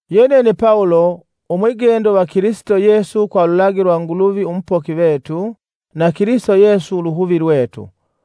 Yenene Pawulo, umwigendo va Kilisito Yesu kwa ululagi lwa Nguluvi umupoki vetu na Kilisito Yesu uluhuvi lwetu,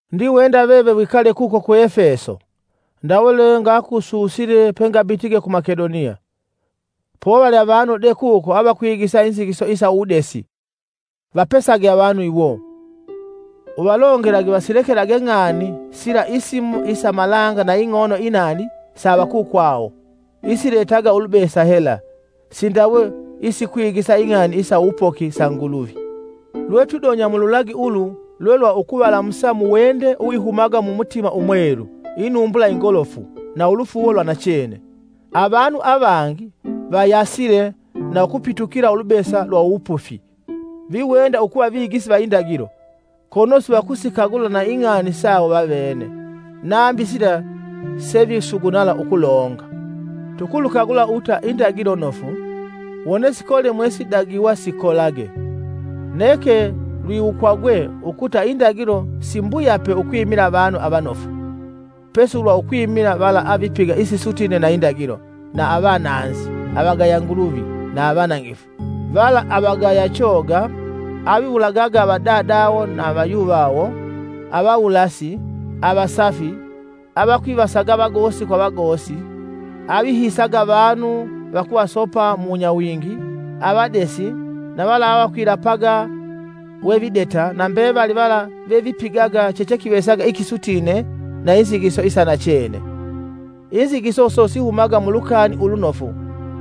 Ndiwenda veve wikale kuko ku Efeso, ndawe lwengakususile pengabitige ku Makedoniya. Povali avanu de kuko avakwigisa inzigiso isa uwudesi. Vapesage avanu iwo. Uvalongelage vasilekage ng'ani sila isimo isa malanga na ing'oono inaali sa avakukwawo, isiletaga ulubesa hela, sindawe isikwigisa ing'ani isa uwupoki sa Nguluvi. Lwetwidonya mu lulagi ulu lwe lwa ukuvalamusa muwende uwihumaga mumutima umwelu, inumbula ingolofu, na ulufuuwo lwa nachene. Avanu avangi vayasile na ukupitukila ulubesa lwa uwupufi. viwenda ukuva vigisi va indagilo, kono sivakusikagula na ing'ani sawo vavene, nambi sila sevisugunala ukulonga. Tukulukagula ukuta indagilo nofu, wone sikole mwesidagiwa sikolage. Neke lwiwukwagwe ukuta indagilo simbuyape ukwimila avanu avanofu, pesi ulwa ukwimila vala avipiga isisutine na indagilo, na avananzi, avagaya Nguluvi na avanangifu, vala avagaya choga, aviwulagaga avadadawo na vayuvawo, avawulasi, avasafi, avakwivaga vagosi kwa vagosi, avihiisaga avanu vakuvasopa mu wunyawingi, avadesi na vala avakwilapaga we videta na mbevali vala vevipigaga chechekivesaga ikisutine na inzigiso isa nachene. Inzigiso iso sihumaga mu Lukani Ulunofu,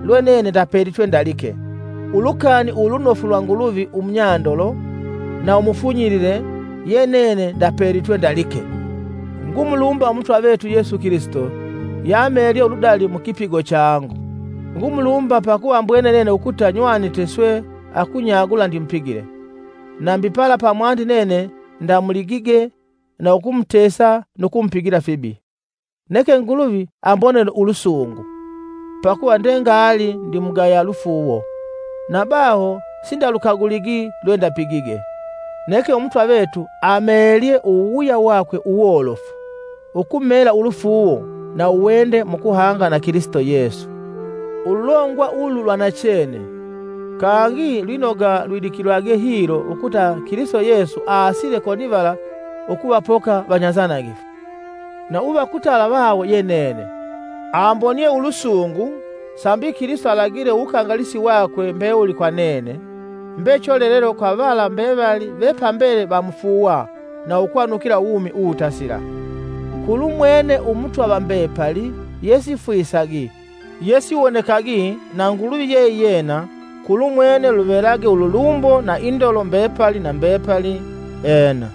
lwe nene ndapelitwe ndalike. Ulukani Ulunofu lwa Nguluvi umunyandolo na umufunyilile ye nene ndapelitwe ndalike. Ngumulumba Umutwa vetu Yesu Kilisito yeamelye uludali mu kipigo changu. Ngumulumba pakuva ambwene nene ukuta nywanite swe akunyagula ndimupigile, nambi pala pamwandi nene ndamuligige na ukumutesa nu kumupigila fibi. Neke Nguluvi ambonele ulusungu, pakuva ndengali ndimugaya lufuuwo, na baho sindalukaguligi lwendapigige. Neke Umutwa vetu ameelye uwuwuya wakwe uwolofu, ukumeela ulufuuwo na uwende mu kuhanga na Kilisito Yesu. Ululongwa ulu lwa nachene, kangi lwinoga lwidikilwage hilo ukuta Kilisito Yesu aasile konivala ukuvapoka vanyanzanangifu. Na viva kutala vawo ye nene, ambonie ulusungu sambi Kilisito alagile uwukangalisi wakwe mbewuli kwa nene, mbe cholelelo kwa vala mbevali ve pambele vamufuuwa na ukwanukila uwumi uwutasila. Kulumwene Umutwa va mbepali, yesifwisagi, yesiwonekagi na Nguluvi kulumwene luvelage ululumbo na indolo mbepali na mbepali! Ena.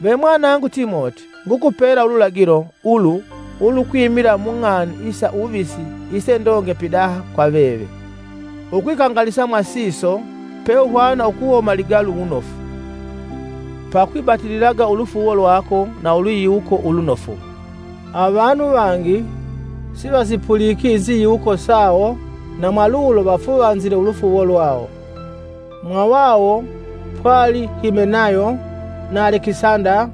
Ve mwanangu Timoti, ngukupela ululagilo ulu ulukwimila mung'ani isa uwuvisi isendonge pidaha kwa veve. Ukwikangalisa mwa siso peuhwana ukuhoma ligalu wunofu, pakwibatililaga ulufuuwo lwako na ulwiyiwuko ulunofu. Avanu vangi sivasipuliki inziyiwuko sawo na mwalulo vafuvanzile ulufuuwo lwawo. Mwavawo pwali Himenayo na Alekisanda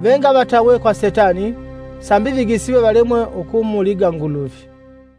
vengavatawe kwa setani, sambi vigisiwe valemwe ukumuliga Nguluvi.